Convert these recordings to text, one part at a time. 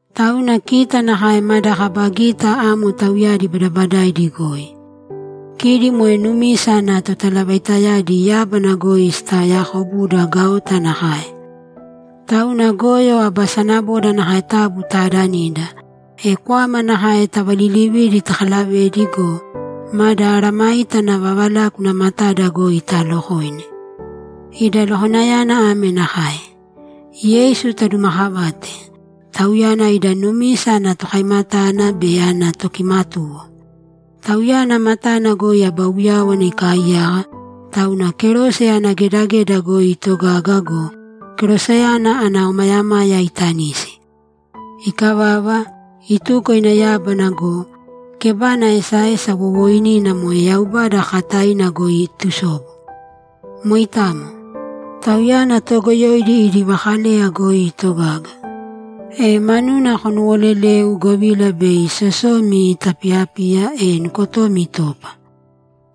Tauna kita nakae mada kaba gita amo tauyadi badabadaidi goi. Kidi moe numisa ana totalavaitayadi yábana goi sitaoyakobuda gaota nakae. Tauna goyo aba sanaboda nakae taabu taadanīda, e kwama nakae tavalilivīdi takalavēdi go, mada mesayágana vavalákuna matada goi taalokōine. Ida lokoinayana ame nakae: Yeisu tadumaakavāte; Tauyana ida numisa ana Tokaimatana be ana Tokimatuwo. Tauyana matana goi aba uyáwana ikaaiyaka, tauna kerose ana gedageda goi itogaga go, keroseyana ana omayamaya itanisi. Ikavava, ituko ina yábana go, kébana esaesa wowooinina moe Yaubada kakataina goi itusobu. Moitamo. Tauyana toogoyoidi idi vakaleya goi itogaga, e manuna konuwolelēu, govila bei sosomi itapiyapiya, e nukotomi itopa.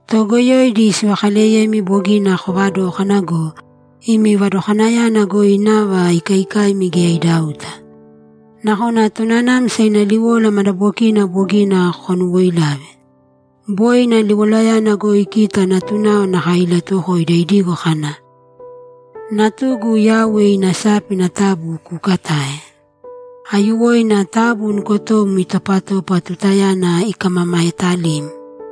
Toogoyoidi sivakaleyemi bogina kovadókana go, imi vadokanayana goi nava ikaikaimi geya idauta. Nakona tonanamsa ina liwola madabokina bogina konuwoilave. Boi ina liwolayana goi kita natunao nakae ilatuwokoida idigo kana, ‘Natugu, Yauwe ina sápina taabu kuukatāe. Aiyuwoina taabu nukotom itopatōpa tutayana ikamamaetalim.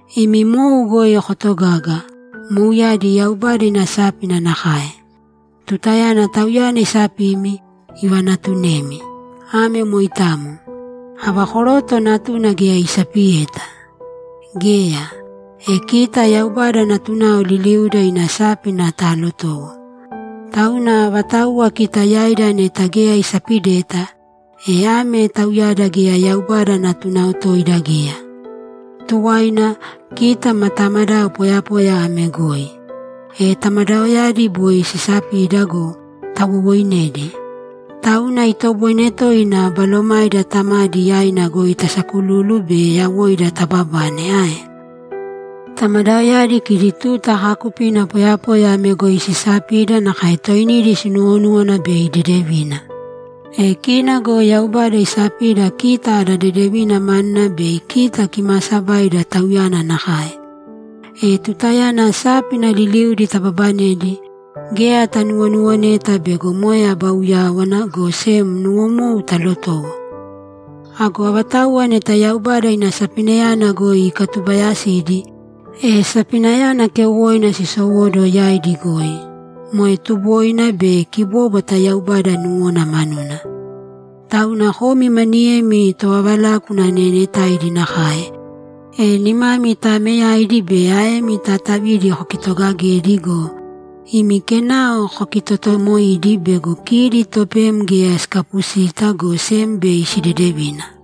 Imi mou goi kotogāga; mouyadi Yaubada ina sápina nakae. Tutayana Tauyana isapimi, ivanaatunemi. Ame moitamo. Ava koroto natuna geya isapiyeta? Geya. E kita Yaubada natunao liliuda ina sápina talotowo. Tauna avatauwa kita yaida neta geya isapideta, e ame tauyada geya Yaubada natunao toida geya. Tuwaina, kita ma tamadao poyapoya ame goi. E tamadaoyadi boi sisapida go, tawowoinedi. Tauna itoboine toina balomaida Tamadi yaina goi tasakululu be yawoida tababane ae? Tamadaoyadi kidi tuta kaakupina poyapoya ame goi sisapida nakae toinidi sinuwonúwana bei dedevina. E kina go Yaubada isapida kita ada dedevina manuna bei kita kimaasabaida Tauyana nakae. E tutayana sápina liliudi tababanedi, geya tanuwonuwoneta bego moe aba uyáwana, go sem nuwomou talotowo. Ago avatauwa neta Yaubada ina sapinayana goi ikatubayasidi, e sapinayana keuwoina sisowóduwo yaidi goi, moe tuboina be kibóbwata Yaubada nuwona manuna. Tauna komi maniyemi tovavalákuna neenetaidi nakae, e nimami taameyaidi be aemi taatavidi kokitogagēdi go, imi kenao kokitotomoiīdi bego kidi topem geya sikapusita, go sem bei sidedevina.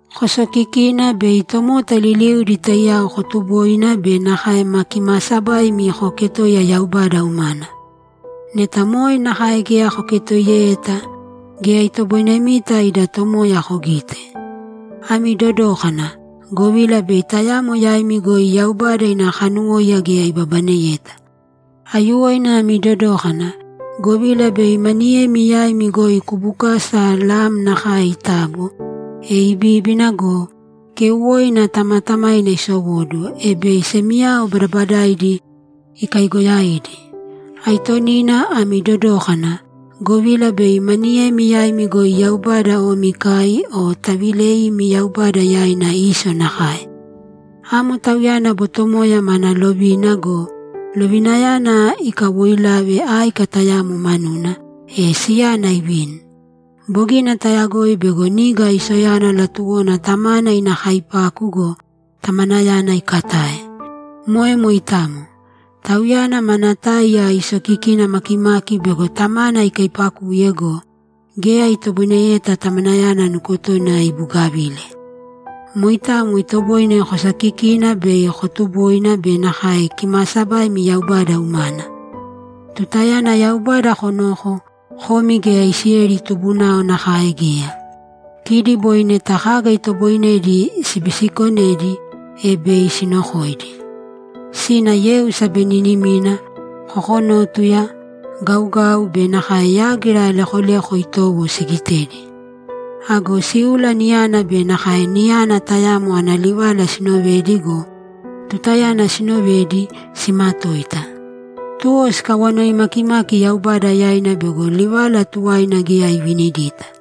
Kosokikīna bei tomota liliudi taiyao kotuboina be nakae ma kimaasabaimi kooketoiya Yaubada umana. Neta moe nakae geya koketoiyeta, geya itoboinemita ida Tomoya kogite. Ami dodōkana, govila bei tayamo yaimi goi Yaubada ina kanuwóiya geya ibabaneyeta. Aiyuwoina ami dodōkana, govila bei maniyemi yaimi goi kubukasa lam nakae itabo, e ibíbina go, keuwoina tamatamaina isowóduwo, e bei semiyao badabadaidi ikaigoyaidi. Aitonina ami dodōkana, govila bei maniyemi yaimi goi Yaubada omi ikai o taviileimi Yaubada yaina Iso nakae. Amo tauyana botomoya mana lovina go, lovinayana ikawoilave áika tayamo manuna, e siyana ivini. Bogina tayagoi bego niga Isoyana latuwona tamana ina kaipaku go, tamanayana ikatae. Moe moitamo. Tauyana mana táiya isokikina makimaki bego tamana ikaipakuye go, geya itoboineyeta tamanayana nukotona ibugavile. Moitamo itoboine kosokikina bei kotuboina be nakae kimaasabaimi Yaubada umana. Tutayana Yaubada konoko, komi geya Isileli tubunao nakae geya. Kidi boi neta kaga itoboinedi sibisikonedi, e bei sinokoidi. Sina yeu sabeninimina, kokonótuya, gaugau be nakae yágira lekoleko itowo sigitedi. Ago síula niyana be nakae níyana tayamo ana livala sinovedi go, tutayana sinovedi, simatoita. Tuwo sikawanoi makimaki Yaubada yaina bego livala tuwaina geya ivinidita.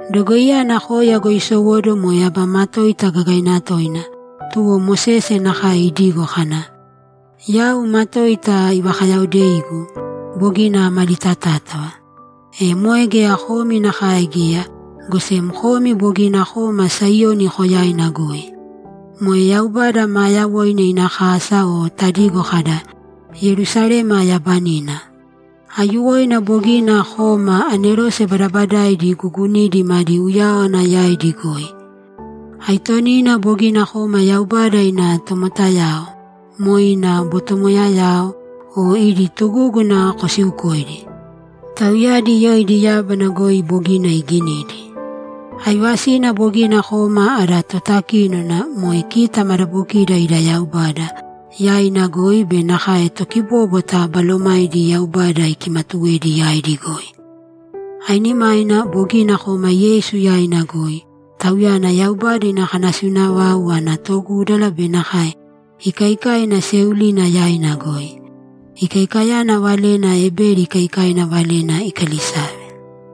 Dogoiyana koya goi isowóduwo moe aba matoita gagaina toina, tuwo Mosese nakae idigo kana, ‘Yau matoita ivakayaodeigu; bogina amalitatátava.’ E moe geya komi nakae geya, go sem komi bogina koma Saiyoni Koyaina goi. Moe Yaubada maa yawoina ina kasa o tadigo kada, ‘Yerusalema yabanina.’ Aiyuwoina bogina koma anerose badabadaaidi guugunidi madi uyáwana yaidi goi. Aitonina bogina koma Yaubada ina tomotayao, moe ina botomoyayao, e idi tugúguna kosiukoidi. Tauyadi yoidi yábana goi bogina iginidi. Aivasina bogina koma ada Totakínona, moe kita madabokida ida Yaubada, yaina goi be nakae tokibóbwata balomaidi Yaubada ikimatuwedi yaidi goi. Ainimaina bogina koma Yeisu yaina goi, Tauyana Yaubada ina kanasiuna vau ana togúdala be nakae ikaikaina seeulina yaina goi. Ikaikayana valena Ebeli ikaikaina valena ikalisave.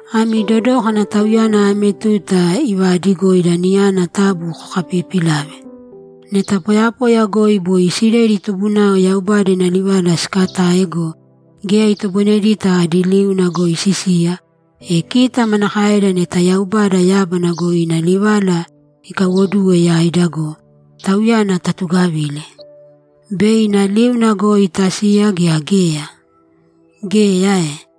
Ami dodōkana Tauyana ame tuta ivaadigoida niyana taabu kokapiipilāve. Neta poyapoya goi boi Isileli tubunao Yaubada ina livala sikatae go, geya itoboinedita adi liuna goi sisiya, e kita manakaeda neta Yaubada yábana goi ina livala ikaiwoduwe yaida go, Tauyana tatugavile? Bei ina liuna goi tasiya gea geya? Geya ae?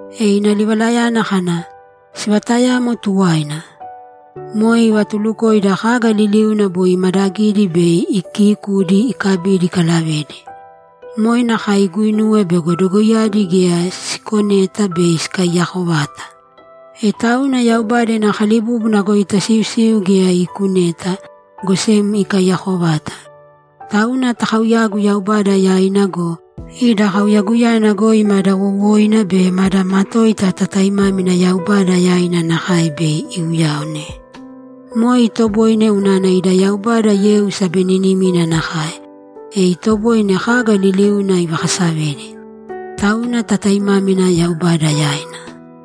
E ina livalayana kana, ‘Sivatayamo tuwaina.’ Moe ivatulukoida kaga liliuna boi imadagidi bei ikiikudi ikabidi ikalavedi. Moe nakae iguinuwe bego dogoiyadi geya siikuneta bei sikaiyako vata. E tauna Yaubada ina kalibúbuna goi tasiusiu geya iikuneta, go sem ikaiyako vata. Tauna takauyāgu Yaubada yaina go, ida kauyaguyana goi mada wowoina be mada matoita tataimámina Yaubada yaina nakae bei iuyaone. Moe itoboine unana ida Yaubada yeu sabeninimina nakae, e itoboine kaga liliuna ivakasavedi. Tauna tataimámina Yaubada yaina.